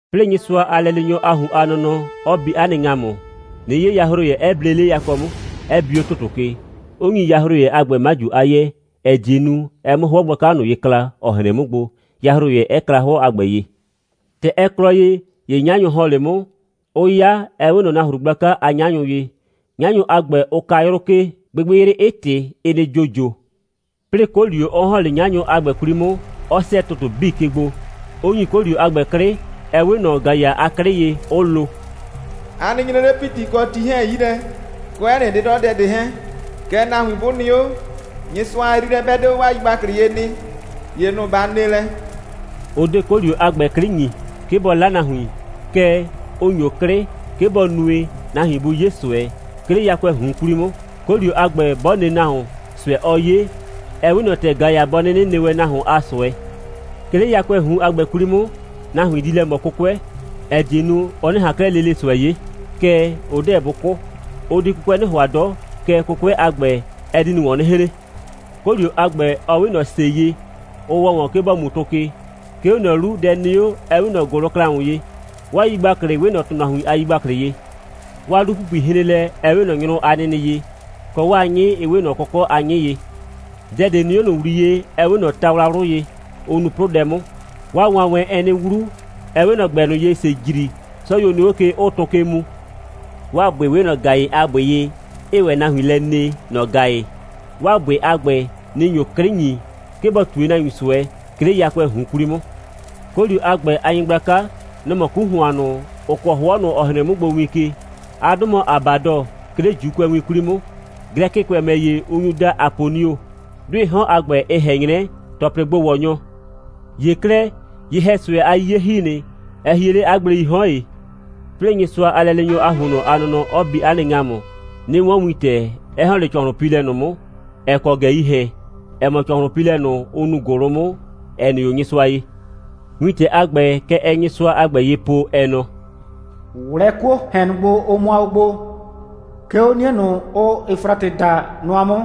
'Plɩɩ, Nyɩsʋa a lɛleenyɔ a ꞊hun a nɔnɔ 'ɔ bi 'a nɩ ‑ŋamʋ, 'nɩ 'ye yahroyɛ, 'ɛ ble 'le yakɔ 'mʋ, 'ɛ bi 'o ‑tʋtʋ ke, 'ʋ ‑nyi yahroyɛ a ‑gbɛ 'maju a 'yɛɛ, ‑ɛ die nu, ɛ 'mʋ 'hʋɔ gblaka ꞊nʋ ye kla, ‑ɔ hren 'mʋ gbo, yahroyɛ 'ɛ kla 'hʋɔ a ‑gbɛ ye. ‑Tɛ ɛ klɔ ye, ‑ye 'nyanyʋ ‑hɔn 'le 'mʋ, 'ʋʋ 'ya, ‑ɛ 'we ꞊nɔ nahru gblaka a 'nyanyʋ ye. 'Nyanyʋ a ‑gbɛ, ʋ ka 'yrʋ ke, gbɩgbɩyrɩ 'ɩ ꞊tɩ, 'ɩ nɩ ‑jojo, 'plɩɩ 'kolio 'ɔ ‑hɔn 'le 'nyanyʋ a ‑gbɛ 'kwli 'mʋ, 'ɔ 'sɛɛ ‑tʋtʋ 'bii ke gbo, 'ʋ ‑nyi 'kolio a ‑gbɛ 'klɩ, ‑ɛ 'we ꞊nɔ ‑gaya a 'klɩ ye, 'ʋ lo: «A nɩ nyre 'le ‑piti kɔ ti 'hɛɛn 'yi lɛ, kɔ 'ɛ nɩ 'dɩdɔdɛ ꞊de 'hɛɛn. Kɛɛ, nahuin 'bʋ nɩ 'o, Nyɩsʋa a yriilɛ 'bɛ 'de 'o 'waa yigbaklɩ ye nɩ, ‑ye nʋ‑ ba ne lɛ.» Ʋ 'de 'kolio a ‑gbɛ 'klɩ ‑nyi, 'ke bʋ 'la nahuin. Kɛɛ, ʋ ‑nyo 'klɩ, 'ke bɔ nue, nahuin bʋ 'ye ꞊sʋɛ, 'ke 'le yakʋɛɛ ꞊hun 'kwli 'mʋ. 'Kolio a ‑gbɛ, 'bɔ ne nahuon, ꞊sʋɛ, ɔɔ 'ye, ɛ 'we ꞊nɔ ‑tɛ ‑gaya bɔ 'nɩnɩ ne wɛn nahuon a ꞊sʋɛ. 'Ke 'le yakʋɛɛ ꞊hun a ‑gbɛ 'kwli 'mʋ, nahuin di lɛ ꞊mɔ 'kʋkʋɛ, ‑ɛ die nu, ʋ 'nɩ ꞊han 'klɛɛ lele ꞊sʋɛ 'ye, kɛɛ, ʋ 'deɛ bʋ 'kʋ. Ʋ di 'kʋkʋɛ 'nɩ ‑hʋa 'dɔ, kɛɛ, 'kʋkʋɛ a ‑gbɛ, ɛ di ꞊nʋ ‑wɔn 'nɩ hren. 'Kolio a ‑gbɛ, ɔ 'we ꞊nɔ ‑se ye, ʋ ‑wɔ ‑wɔn, 'ke ‑bɔ mu tʋ ke. 'Ke 'o ꞊nʋ 'lu, dɛ nɩ 'o, 'ɛ 'we ꞊nɔ ‑gʋlʋklaʋn ye. 'Waa yigbaklɩ 'we ꞊nɔ ‑tʋnahuin a yigbaklɩ ye. 'Waa 'lu‑pupui hren lɛ, ‑ɛ 'we ꞊nɔ nyrʋ a nɩnɩ ye, kɔ, 'waa 'nyɩ 'ɩ 'we ꞊nɔ kɔkɔ' a 'nyɩ ye. Dɛ ꞊de nɩ 'o ꞊nʋ ‑wliye, 'ɛ 'we ꞊nɔ tawlawlʋ ye, ʋ nuu 'plʋdɛ 'mʋ. 'Waa wanwɛn, ɛɛ 'nɩ 'wlu, ‑ɛ 'we ꞊nɔ ‑gbɛ ꞊nʋ ye, ‑see ‑jri, 'sɔyuo nɩ 'o ke, 'ʋʋ tʋ ke mu. 'Waa ‑bʋɩ 'we ꞊nɔ ‑gayɩ a ‑bʋɩ ye, 'ɩɩ ‑wɛ nahuin lɛ ne, ‑nɔ ‑gayɩ. 'Waa ‑bʋɩ a ‑gbɛ, nɩ‑ nyo 'klɩ ‑nyi, 'ke bɔ ꞊tue nahuin ꞊sʋɛ, 'ke 'le yakʋɛɛ ꞊hun 'kwli 'mʋ. 'Kolio a ‑gbɛ a nyɩgblaka, nɔ‑ mɔ 'ku ‑hʋan ꞊nʋ, ‑ʋ kɔɔ 'hʋɔ ꞊nʋ, ‑ɔ hren 'mʋ gbo win ke. 'A 'dʋ mɔ Abadɔ, 'ke 'le ‑Juukʋɛwin 'kwli 'mʋ. Glɛkɩkʋɛ ‑mɛ ‑ye, ʋ nyu daa Aponio. 'Dʋɩɩ 'hɔn a ‑gbɛ, ɩ ꞊hɛn 'nyrɛ ‑Tɔplɩgbo‑wɔnyɔ. ‑Ye 'klɛɛ, ye‑hɛ꞊sʋɛ a 'yiye ‑hi nɩ. Ɛ hie 'le 'a gbleii 'hɔn ‑ye. 'Plɩɩ Nyɩsʋa a lɛleenyɔ a ‑huonnɔ a nɔnɔ 'ɔ bi 'a nɩ ‑ŋamʋ, 'nɩ 'wɔn wintɛ, 'ɛ ‑hɔn 'le ‑cɔhlʋnpiilɛ ꞊nʋ 'mʋ, ‑ɛ kɔ ꞊gɛii ‑hɛn. Ɛ mɔ ‑cɔhlʋnpiilɛ ꞊nʋ, ʋ nuu ‑gʋlʋ 'mʋ, ‑ɛ nɩ 'o Nyɩsʋa ye. Wintɛ a ‑gbɛ, kɛ ɛɛ Nyɩsʋa a ‑gbɛ ye po, ɛ nɔ: «꞊Wlɛɛ 'kuoo ‑hɛn ꞊nʋ gbo, ʋ mʋa o gbo, 'ke 'o 'nie ꞊nʋ, ʋʋ Efratɩ daa nʋa 'mʋ!»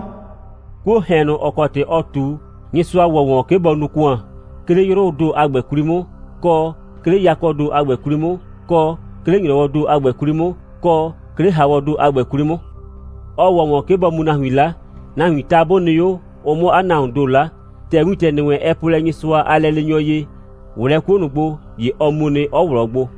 'Kuoo ‑hɛn ꞊nʋ, ‑ɔ kɔ ‑tɩ ɔ ꞊tu, Nyɩsʋa ‑wɔ ‑wɔn, 'ke bɔ nu ‑kʋan, 'ke 'le 'yrʋʋ ‑do a ‑gbɛ 'kwli 'mʋ, kɔ, 'ke 'le yakɔɔ ‑do a ‑gbɛ 'kwli 'mʋ, kɔ, 'ke 'le ‑nyrɔwɔɔ ‑do a ‑gbɛ 'kwli 'mʋ, kɔ, 'ke 'le ‑haawɔɔ ‑do a ‑gbɛ 'kwli 'mʋ. Ɔ ‑wɔ ‑wɔn, 'ke bɔ mu nahuin 'la, nahuiin ta 'bʋ nɩ 'o, ʋ 'mʋ 'a nahuoon ‑do 'la. ‑Tɛ wintɛ ‑nɩ wɛn, ɛ po lɛ Nyɩsʋa a lɛleenyɔ ye: «꞊Wlɛɛ 'kuo ꞊nʋ gbo!» ‑ye ɔ mu nɩ, 'ɔ ꞊wlɔɔ gbo.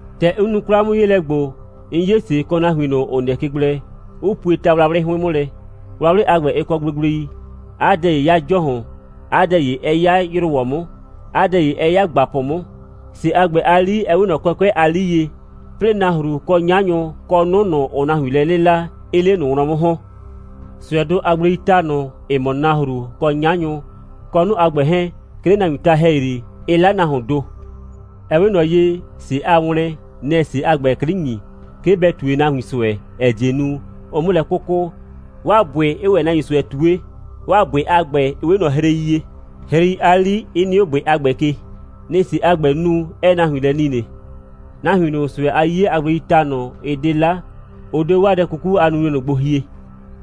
‑Tɛ 'n nu 'kwla'mʋ'yeelɛ ‑gbo, 'n 'ye ‑se, kɔ nahuin ꞊nʋ, ‑ʋ nɩɛ ke gblɛ, 'ʋ pue tawlawlɩ 'hʋɩn 'mʋ lɛ. Wlawlɩ a ‑gbɛ, ɩ kɔ gblegblei. 'A dɛ ‑ye 'ya ‑jɔhʋn, 'a dɛ ‑ye 'ɛ 'ya ‑yrʋwɔ 'mʋ, 'a dɛ ‑ye 'ɛ 'ya ‑gbapʋ 'mʋ. ‑Se a ‑gbɛ a 'li, ɩ 'we ꞊nɔ kɔkʋɛ' a 'li ye, 'plɩɩ nahru, kɔ 'nyanyʋ, kɔ 'nʋ ꞊nʋ, ‑ʋʋ nahuin lɛ 'lɩla, 'ɩɩ 'le ꞊nʋ wlɔn 'mʋ ‑hɔn. ꞊Sʋɛdʋ a gbleii ta ꞊nʋ, ‑ɩ mɔ nahru, kɔ 'nyanyʋ, kɔ 'nʋ a ‑gbɛ 'hɛɛn, 'ke 'le nahuiin ta ‑hɛyri, ɩ 'la nahuoon ‑do. Ɛ 'we ꞊nɔ ye, ‑se a wlɛn, nɛ‑ɛ ‑se a ‑gbɛ 'klɩ ‑nyi, 'ke bɛ ꞊tue nahuin ꞊sʋɛ, ‑ɛ die nu, ʋ 'mʋ lɛ 'kʋkʋ, 'waa ‑bʋɩ 'ɩɩ ‑wɛ nahuin ꞊sʋɛ ꞊tue, 'Waa ‑bʋɩ a ‑gbɛ, ɩ 'we ꞊nɔ hrei ye, hrei a 'li 'ɩ nɩ 'o ‑bʋɩ a ‑gbɛ ke. Nɩ‑ ‑se a ‑gbɛɛ nu, 'ɛɛ nahuin lɛ nine. Nahuin ꞊nʋ, ꞊sʋɛ a 'yiye a gbleii ta ꞊nʋ, ɩ 'de 'la, ʋ 'de 'o 'waa dɛ 'kuku a nunue ꞊nʋ gbo hie,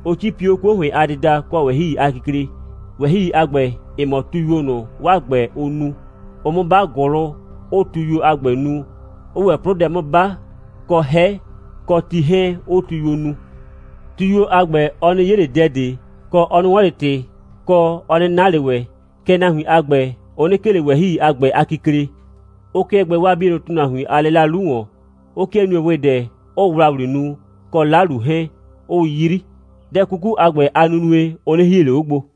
'ʋ 'cipi 'o 'kuo ‑hʋɩn a dɩda, kɔ ꞊wɛhɩi a kikle. ꞊Wɛhɩi a ‑gbɛ, ɩ mɔ tuyuo ꞊nʋ, 'waa ‑gbɛ, ʋʋ nu. Ʋʋ 'mʋ 'ba ‑gʋlʋ, 'ʋʋ tuyuo a ‑gbɛ nu, 'ʋʋ ‑wɛ 'plʋdɛ 'mʋ 'ba, kɔ 'hɛ, kɔ ti 'hɛɛn, 'ʋʋ tuyuo nu. Tuyuo a ‑gbɛ, ɔ 'nɩ 'ye ꞊le dɛ ꞊de, kɔ, ɔ 'nɩ 'wɔn ꞊le ‑tɩ, kɔ, ɔ 'nɩ na ꞊le ‑wɛ. Kɛɛ, nahuin a ‑gbɛ, ʋ 'nɩ 'kee ꞊le ꞊wɛhɩi a ‑gbɛ a kikle, 'ʋ 'kɩɛ gbɛɛ 'waa 'bienʋ ‑tʋnahuin a 'lɩla 'lu ‑wɔn, 'ʋ 'kɩɛ nue ‑wɩdɛ, 'ʋʋ ‑wlawli nu, kɔ 'lalu 'hɛɛn, 'ʋʋ 'yri. Dɛ 'kuku a ‑gbɛ a nunue, ʋ 'nɩ hie ꞊le 'o gbo.